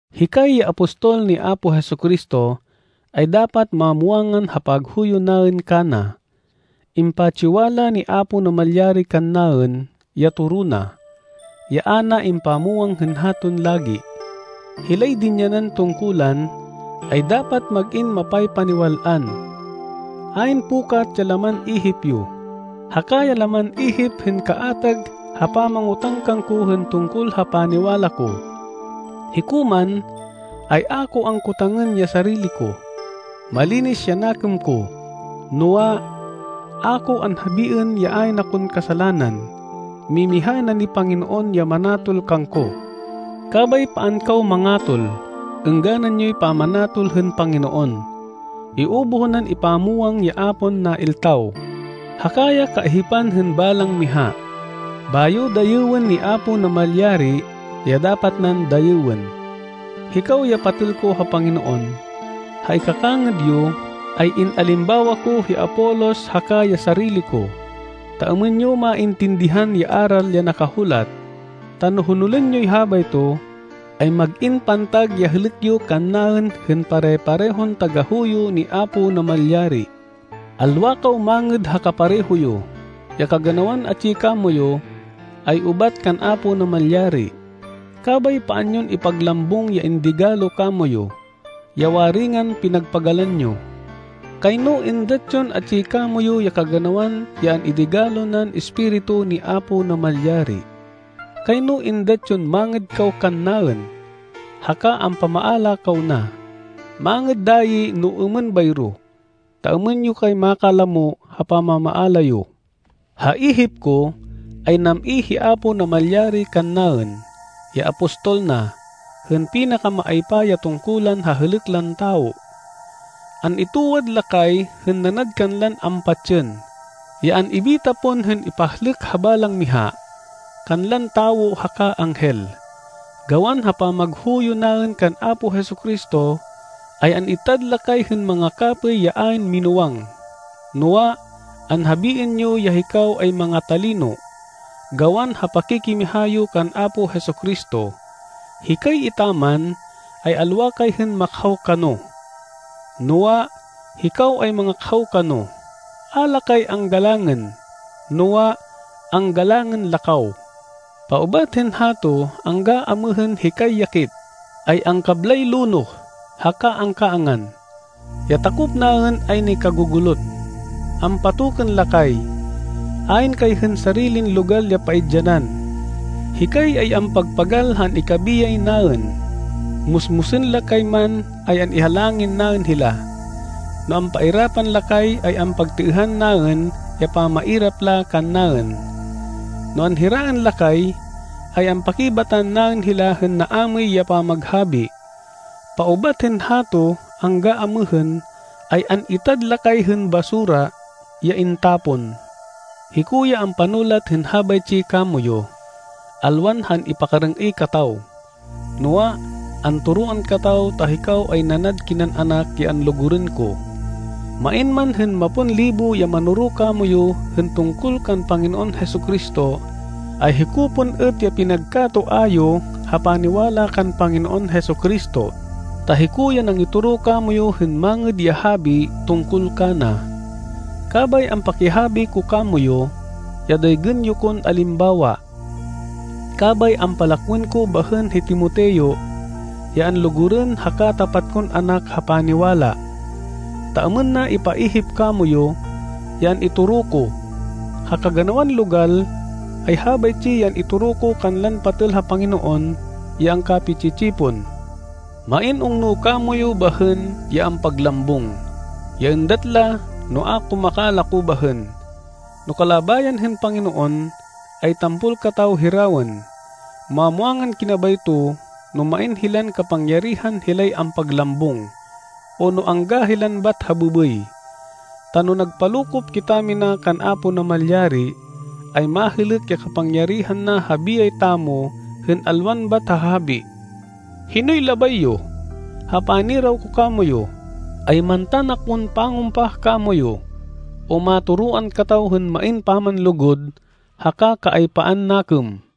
Hikay ya apostol ni Apo Jesu-Cristo, ay dapat mamwangan ha paghuyo naên kana. Impatsiwala ni Apo Namalyari kannaên ya toro na, ya a na impamwang hên haton lagi. Hilay dinyanan tungkulan, ay dapat mag-in mapaypaniwal-an. Ayn pukat ya laman ihip yo, haka ya laman ihip hên kaatag ha pamangotang kangko hên tungkol ha paniwala ko. Hiko man, ay a ko angkotangên ya sarili ko. Malinis ya nakêm ko. Noa, a ko anhabiên ya ayn akon kasalanan. Mimiha na ni Panginoon ya manatol kangko. Kabay paan kaw mangatol. Êngganan yoy pamanatol hên Panginoon. Iubuh nan ipamwang ya a pon nailtaw, haka ya kaihipan hên balang miha. Bayo dayêwên ni Apo Namalyari ya dapat nan dayêwên. Hikaw ya patêl ko ha Panginoon, ha ikakangêd yo ay in-alimbawa ko hi Apolos haka ya sarili ko, ta êmên yo maintindihan ya aral ya nakahulat. Ta no honolên yoy habayto, ay mag-in pantag ya hêlêk yo kannaên hên pare-parehon tagahuyo ni Apo Namalyari. Alwa kaw mangêd ha kapareho yo. Ya kaganawan atsi kamoyu, ay ubat kan Apo Namalyari, kabay paan yon ipaglambung ya indigalo kamoyu, ya waringan pinagpagalan yo. Kayno êndat yon atsi kamoyu ya kaganawan ya an-idigalo nan Espiritu ni Apo Namalyari. Kayno êndat yon mangêd kaw kannaên, haka ampamaala kaw na. Mangêd dayi no êmên bayro, ta êmên yo kay makalamo ha pamamaala yo. Ha ihip ko, ay nam-i hi Apo Namalyari kannaên, ya apostol na, hên pinakamaaypa ya tungkulan ha hêlêk lan tawo. An-itwad la kay hên nanad kanlan ampatsên, ya an-ibita pon hên ipahlêk ha balang miha, kanlan tawo haka anghel. Gawan ha pamaghuyo naên kan Apo Jesu-Cristo, ay an-itad la kay hên mangakapêy ya ayn minúwang. Noa, anhabiên yo ya hikaw ay manga-talino, gawan ha pakikimiha yo kan Apo Jesu-Cristo. Hikay etaman, ay alwa kay hên makhaw kano. Noa, hikaw ay mangakhaw kano. A la kay anggalangên, noa, anggalangên la kaw. Paubat hên hato angga amêhên hikay ya kit, ay angkablay lonoh haka angkaangan. Ya takop naên ay nikagugulot. Ampatokên la kay. Ayn kay hên sarilin logal ya paidyanan. Hikay ay ampagpagal ha an-ikabiyay naên. Musmusên la kay man ay an-ihalangin naên hila. No ampairapan la kay ay ampagtêêhan naên ya pamairap la kannaên. No anhiraên la kay, ay ampakibatan naên hila hên naamêy ya pamaghabi. Paubat hên hato angga amêhên ay an-itad la kay hên basura, ya intapon. Hiko ya ampanulat hên habaytsi kamoyu, alwan ha an-ipakarêng-êy kataw, noa, antoroan kataw ta hikaw ay nanad kinan anak ya anlugurên ko. Main man hên mapon libo ya manoro kamoyu hên tungkol kan Panginoon Jesu-Cristo, ay hiko pon êt ya pinagka-toa yo ha paniwala kan Panginoon Jesu-Cristo, ta hiko ya nangitoro kamoyu hên Mangêd ya Habi tungkol kana. Kabay ampakihabi ko kamoyu, ya daygên yo kon alimbawa. Kabay ampalakwên ko bahên hi Timoteo, ya anlugurên haka tapat kon anak ha paniwala, ta êmên na ipaihip kamoyu, ya an-itoro ko. Ha kaganawan logal, ay habaytsi ya an-itoro ko kanlan patêl ha Panginoon ya angkapi-tsi-tsipon. Main ungno kamoyu bahên, ya ampaglambung, ya êndat la no a ko makalako bahên. No kalabayan hên Panginoon, ay tampol kataw hirawên. Mamwangan kina bayto, no main hilan kapangyarihan hilay ampaglambung, o no angga hilan bat ha bêbêy. Ta no nagpalokop kitamina kan Apo Namalyari, ay mahêlêk ya kapangyarihan na ha biyay tamo hên alwan bat ha habi. Hinoy labay yo? Ha paniraw ko kamoyu, ay mantan akon pangumpah kamoyu, o matoroan kataw hên main pamanlugud haka kaaypaan nakêm?